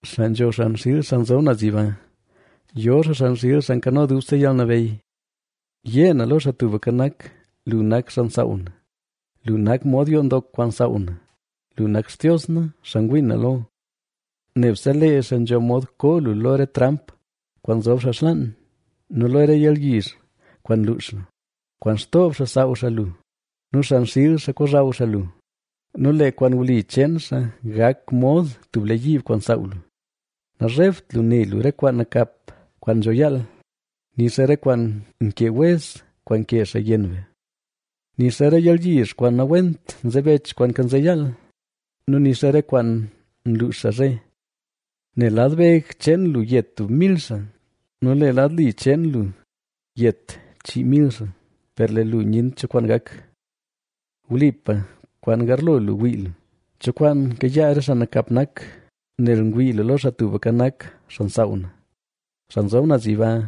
Xaa nzho xan xiil Xaa nzob naz Yiba, yo xaa xan xiil Xaa Nkano Dubse Yalnabeyy. Yé na lo Xaa Tubka Nak: “Lu nak xaa nsaaw na, lu nak mod yoo ndok kwaan nsaaw na, lu nak Xtios na, xaa ngwii na lo.” Nebse lee xaa nzho mod koo lu lo re tramp kwaan nzob xaa xlaan nu lo re yalyizh kwaan nluux xaa. Kwaan xtoob xaa saaw xaa lu nu xan xiil xaa kozhaw xaa lu nu lee kwaan wli cheen xaa gak mod tub lee yiib kwaan saaw lu. Nazhebt lu ne lu re kwaan nakap kwaan nzho yaal, nixa re kwaan nkee wez kwaan nkee xaa yenn be, Nixa re yalyizh kwaan nawent nzebech kwaan kanze yaal, nu nixa re kwaan luux xaa zhe. Nel lad beg cheen lu yet tub mil xaa, nu lee lad li cheen lu yet chii mil xaa, per lee lu nyent cho kwaan gak. Wlipa, kwaan garlo lu wii lu, cho kwaan kayaa re xaa nakap nak. Nel ngwii lu lo Xaa Tubka Nak, xaa nsaaw na, Xaa Nzob Naz Yiba,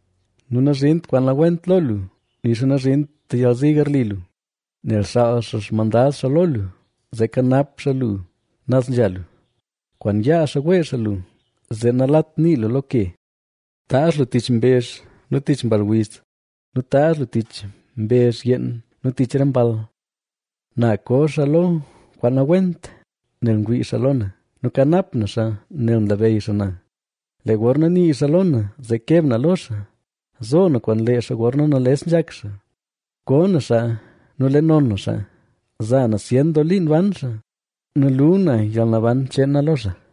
nu nazhint kwaan nawent lo lu, nixa nazhint yalzi garli lu, nel xaal xaa xmandad xaa lo lu, zee kanap xaa lu naz nzha lu. Kwaan yaa xaa wee xaa lu, zee nalat nii lu lo ke. Taazh lu tich mbezh nu tich mball wiz nu taazh lu tich mbezh yeen nu tich re mball. Na ko xaa lo kwaan nawent, nel mwii xaa lo na, nu kanap na xaa, nel nlabeyy xaa na. Lee gorna nii xaa lo na, zee keb na lo xaa; zo na kwaan lee xaa gorna nales nzhak xaa; ko na xaa nu le non na xaa. Za na zyen doo liin ban xaa, nu lu na yalnaban cheen na lo xaa.